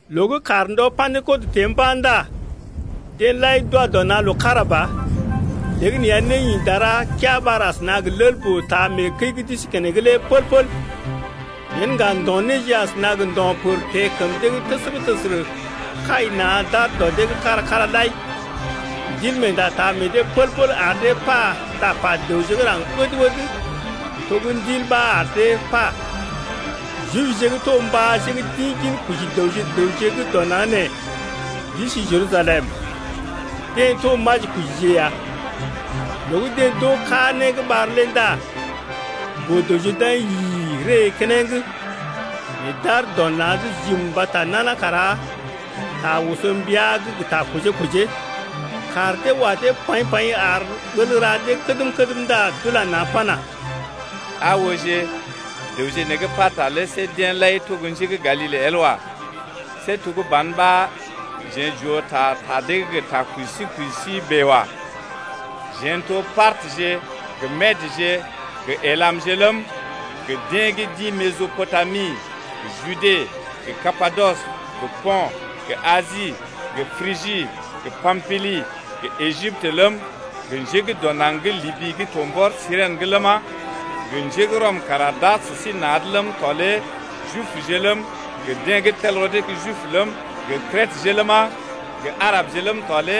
Loo gə́ kàr ndɔ Pa̰dekɔt teḛ mba̰ ndá deḛ lai d’wa dɔ na̰ loo kára ba. Léegəneeya né ḭ dara keaa ɓar asəna gə lel-boo taa mee kəi gə́ d’isi keneŋ lé pəl-pəl. Yen ŋga ndo̰ néje asəna gə ndo̰ pər teḛ kəm dee’g təsərə-təsərə kai na̰ d’aar dɔ dee’g kára-kára lai. Ndilmeenda taa meḛ dee pəl-pəl ar dee pa tapa dəwje gə́ raŋg ɓəd-ɓəd to gə́ Ndil ɓa ar dee pa ya. Jibje gə́ to mbáje gə́ d’ḭ ginkoji dəwje gə raŋg gə́ dɔ naŋg nee, d’isi Jerusalem, deḛ to majikojije ya. Loo gə́ deḛ d’oo kaa né gə́ ɓar lé ndá boo-dəwje d’aḭ yi-i-i ree keneŋ, nɛ d’aar dɔ na̰’d jim mbata nana kara ta oso mbia’g gə ta kojee-kojee. Kaar dee wa dee paḭ-paḭ ar ɓəl ra dee kədm-kədm ndá d’ula na̰ pana: Aa ooje, dəwje nee gə́ pata lé see deḛ lai to gə́ njé gə́ Galile el wa. See to gə́ ban ɓa jeḛ j’oo ta ta dee’g gə ta koji sí koji sí bèe wa. Jeḛ n’toje Partəje gə Medəje gə Elamje ləm, gə deḛ gə́ d’ḭ Mesɔpotami gə Jude gə Kapadɔs gə Po̰t gə Asi gə Prigi gə Pampili gə Ejiptə ləm, gə njé gə́ dɔ naŋg gə́ Libi gə́ to mbɔr Sirèn’g ləma, gə njé gə́ Rɔm kara d’aar sə sí na̰’d ləm tɔ lé Jibje ləm, gə deḛ gə́ tel rɔ dee gə́ Jibje ləm, gə Kretəje ləma, gə Arabəje ləm tɔ lé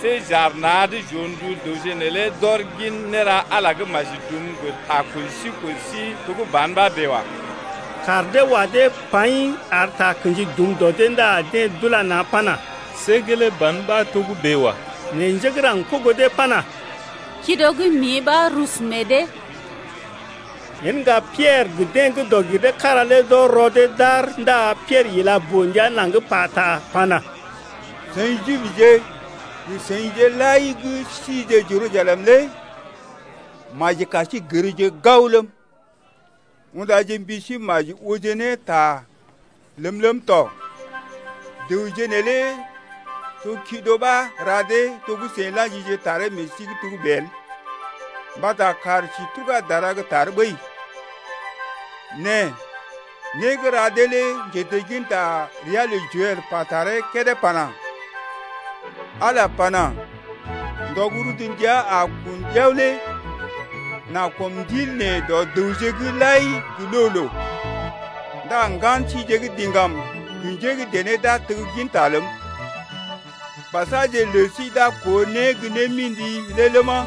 see j’aar na̰’d j’oo ndu dəwje neelé d’ɔr gin néra Ala gə́ maji dum gə ta koji sí koji sí to gə́ ban ɓa bèe wa. Kaar dee wa dee paḭ ar takə̰ji dum dɔ dee ndá deḛ d’ula na̰ pana: See gelee ban ɓa togə́bè wa. Nɛ njé gə́ raŋg kogo dee pana: Kido gə́ mḭ ɓa rusu meḛ dee. Yen ŋga Piɛrə gə deḛ gə́ dɔg-gir-dee-kára lé d’ɔr rɔ dee d’aar ndá Piɛrə ila boo-ndia naŋg pata pana: Seḭ Jibje gə seḭje lai gə́ sije Jerusalem lé maji kar sí gərje gao ləm, undaje mbi sí maji ooje ne ta ləm ləm tɔ! Dəwje neelé to kido ɓa ra dee to gə́ seḭ la̰jije taree meḛ sí’g togə́bè lé el mbata kàr sí tuga dara gə́ tar ɓəi. Nɛ né gə́ ra dee lé njetegginta gə́ ria lə Joɛl pa taree kédé pana: Ala pana: ndɔ gə́ rudu ndəa a gə kun ɗiao lé M’a kɔm Ndilm dɔ dəwje’g lai gə loo-loo. Ndá ŋgan síje gə́ diŋgam gə njé gə́ dené d’a tegginta ləm, Basaje lə sí d’a koo né gə némḭdije lé ləma,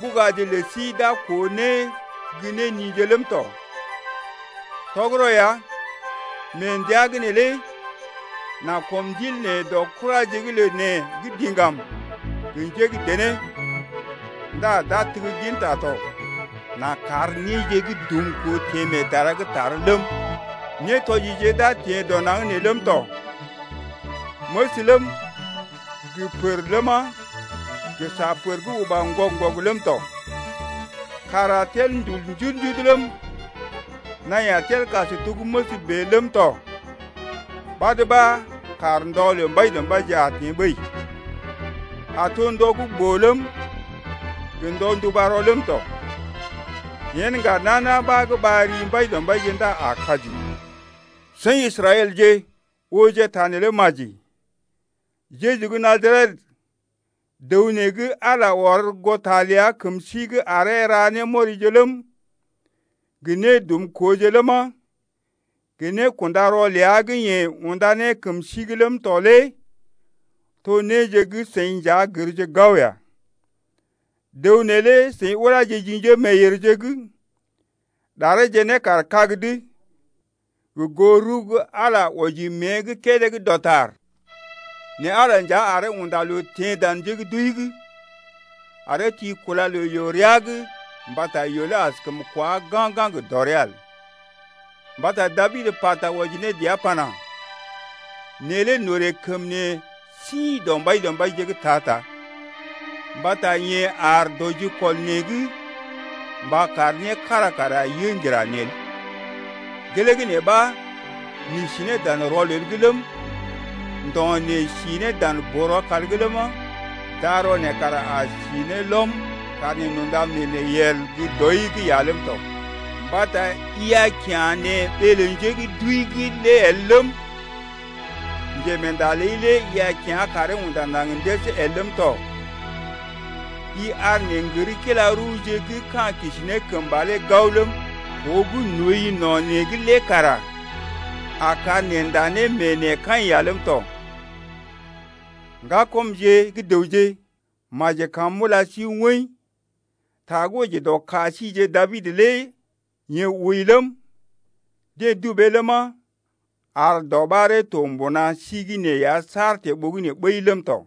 Ɓugaje lə sí d’a koo né gə nije ləm tɔ. Tɔgərɔ ya, mee ndəa’g neelé, m’a kɔm Ndilm dɔ kuraje’g ləm gə́ diŋgam, gə njé gə́ dené, Ndá d’a tegginta tɔ. M’a kar néje gə́ dumkoo teḛ mee dara gə́ tar ləm, Nétɔjije d’a teḛ dɔ naŋg nee ləm tɔ: Məs ləm, gə pər ləma, gə sa pər gə́ uba ŋgɔg-ŋgɔg ləm tɔ. Kàr a tel ndul njudu-njudu ləm, Naḭ a tel kas to gə́ məs bèe ləm tɔ Ɓad ɓa kar ndɔ lə Mbaidɔmbaije a teḛ ɓəi, A to ndɔ gə́ boo ləm, gə ndɔ nduba rɔ ləm tɔ. Yen ŋga nana ɓa gə́ a ɓar ri Mbaidɔmbaije ndá a kaji. Seḭ Israɛlje, ooje ta neelé maji. Jeju gə́ Najaret, dəw nee gə́ Ala ɔr goo ta ləa kəm sí’g aree ra ne némɔrije ləm, gə nédumkooje ləma, gə nékunda rɔ ləa gə́ yeḛ unda ne kəm sí’g ləm tɔ lé to néje gə́ seḭ nja gərje gao ya. Dəw neelé seḭ uláje ji njémeeyèrje’g, ɗareeje ne kaar kag’d, gə goo rəw gə́ Ala nja wɔji mée’g kédé gə́ dɔtar. Nɛ Ala nja aree unda loo teḛ dan njé gə́ d’wəi’g, aree ti kúla lə yoo rəa’g mbata yoo lé askəm kwá ga̰-ga̰ gə dɔrea el. Mbata Dabid pata wɔji ne dəa pana: Neḛ lé n’orè kəm neḛ sḭ dɔ Mbaidɔmbaije’g ta-ta Mbata yeḛ aar dɔ jikɔl neḛ’g mba kar né kára kara yə ŋgira neḛ el. Gelee gə́ nee ɓa n’isi ne dan rɔlel’g ləm, Ndo̰ neḛ si ne dan boo-rɔkal’g ləma, Darɔ neḛ kara a si ne lɔm, kar neḛ n’unda mee neḛ yel gə́ dɔi’g ya ləm tɔ. Mbata i a kya̰ neḛ ɓee lə njé gə́ d’wəi’g lé el ləm, Njemeenda ləi lé i a kyá̰ karee unda naŋg ndəs el ləm tɔ. I ar neḛ n’gər kila-rəwje gə́ ka̰ kisi ne kəmba lé gao ləm, Koo gə́ n’ooi no̰ neḛ’g lé kara a kar neḛ nda ne mee neḛ kaḭ ya ləm tɔ. Ŋgakɔmje gə́ dəwje, maji kam m’ula sí woḭ, ta gə́ wɔji dɔ ka síjeḛ Dabid lé yeḛ wəi ləm, deḛ dubee ləma, ar dɔɓaree to mbuna sí’g nee ya saar teḛ ɓogənè ɓəi ləm tɔ.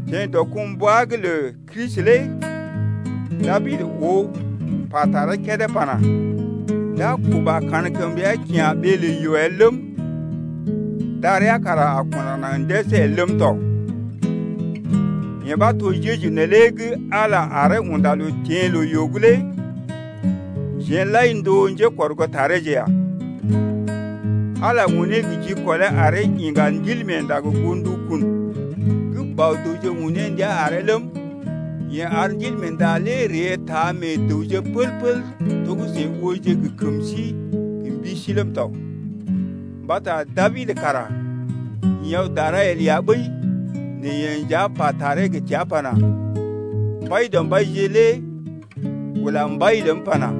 Teḛ dɔkumbwa’g lə Kristi lé Dabid oo pa taree kédé pana: D’a kuba kankəmrea kyá̰ ɓee lə yoo el ləm, Darea kara a kunda naŋg ndəs el ləm tɔ. Yee ɓa to Jeju neelé gə́ Ala aree unda loo teḛ loo-yoo’g lé, jeḛ lai n’to gə́ njékɔrgootareeje ya. Ala unee gə jikɔlee aree iŋga Ndilmeenda gə goo ndukun gə́ Bɔ-dəwje un ne ndia aree ləm, yeḛ ar Ndilmeenda lé ree taa meḛ dəwje pəl-pəl to gə́ seḭ ooje ne gə kəm sí gə mbi sí ləm tɔ. Mbata Dabid kara ḭ aw dara el ya ɓəi nɛ yeḛ nja pa taree gə təa pana: Mbaidɔmbaije lé ula Mbai ləm pana: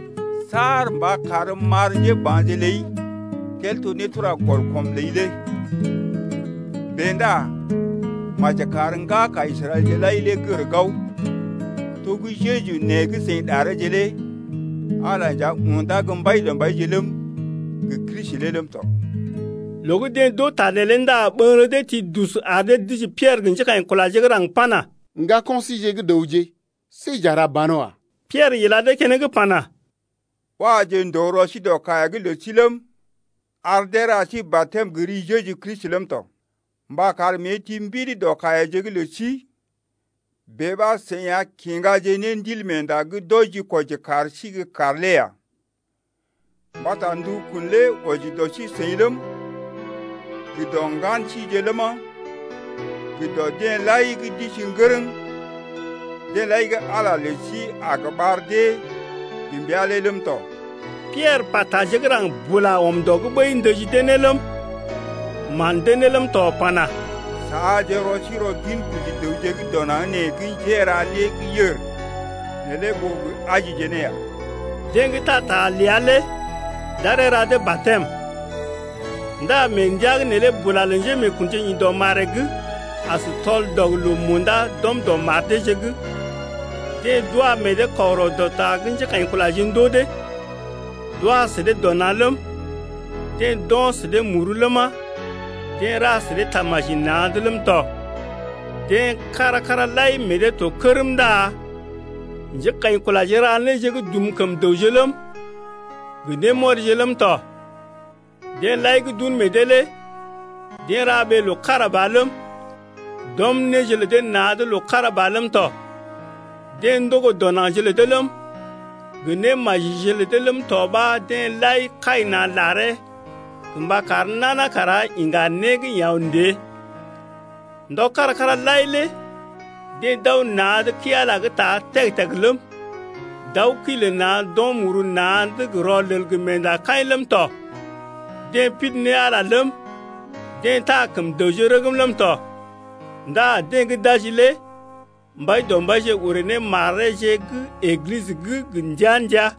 Saar mba karm m’ar njéba̰je ləi Tel to nétura-gɔl-kɔm ləi lé. Bèe ndá maji kar ŋgaka Israɛlje lai lé gər gao, to gə́ Jeju nee gə́ seḭ ɗareeje lé Ala nja undá gə́ Mbaidɔmbaije ləm, gə Kristi lé ləm tɔ. Loo gə́ deḛ d’oo ta neelé ndá ɓəŋgərə dee ti dus ar dee dəji Piɛrə gə njékaḭkulaje gə́ raŋg pana: Ŋgako̰ síjeḛ gə́ dəwje see j’a ra banwa. Piɛrə ila dee keneŋ pana: Waje ndòo rɔ sí dɔ kaiya’g lə sí ləm, ar deeje ra sí batɛm gə ri Jeju Kristi ləm tɔ mba kar mée ti mbidi dɔ kaiyaje’g lə sí. Bèe ɓa seḭ a kiŋgaje ne Ndilmeenda gə́ d’wɔji-kwɔji kar sí gə́ kar lé ya. Mbata ndukun lé wɔji dɔ sí-seḭ ləm, gə dɔ ŋgan síje ləma, gə dɔ deḛ lai gə́ d’isi ŋgərəŋ, deḛ lai gə́ Ala lə sí a gə ɓar dee gə mbəa lé ləm tɔ. Piɛrə pa taje gə́ raŋg bula ɔm dɔ’g ɓəi ndəji dee ne ləm, man dee ne ləm tɔ pana: Saaje rɔ sí rɔ ginkoji dəwje gə́ dɔ naŋg nee gə́ njéra néje gə́ yèr neelé ɓó gə ajije ne ya. Deḛ gə́ taa ta ləa lé d’aree ra dee batɛm. Ndá mee ndəa’g neelé bula lə njémeekunje ḭ dɔ maree’g as tɔl-dɔg-loo-munda d’ɔm dɔ mar deeje’g. Deḛ d’wa meḛ dee kɔgərɔ dɔ ta gə́ njékaḭkulaje ndoo dee lé, d’wa sə dee dɔ na̰ ləm, deḛ d’o̰ sə dee muru ləma, deḛ ra sə dee tamaji na̰’d ləm tɔ. Deḛ kára-kára lai meḛ dee to kərm ndá njékaḭkulaje ra néje gə́ dum kəm dəwje ləm, gə némɔrije ləm tɔ. Deḛ lai gə́ d’un meḛ dee lé deḛ ra ɓee loo kára ba ləm, d’ɔm néje lə dee na̰’d loo kára ba ləm tɔ. Deḛ ndogo dɔ naŋgje lə dee ləm, gə némajije lə dee ləm tɔ ɓa deḛ lai kai na̰ laree gə mba kar nana kara iŋga né gə́ yeḛ aw ndée. Ndɔje kára-kára lai lé deḛ d’aw na̰’d kəi-Ala’g ta teg-teg ləm, d’aw kəi lə na̰ d’o̰ muru na̰’d gə rɔlel gə meendakaḭ ləm tɔ. Deḛ pidi ne Ala ləm, deḛ taa kəm dəwje rəgm ləm tɔ. Ndá deḛ gə́ d’aji lé Mbaidɔmbaije orè ne mareeje gə́ Eglisə’g gə ndəa-ndəa.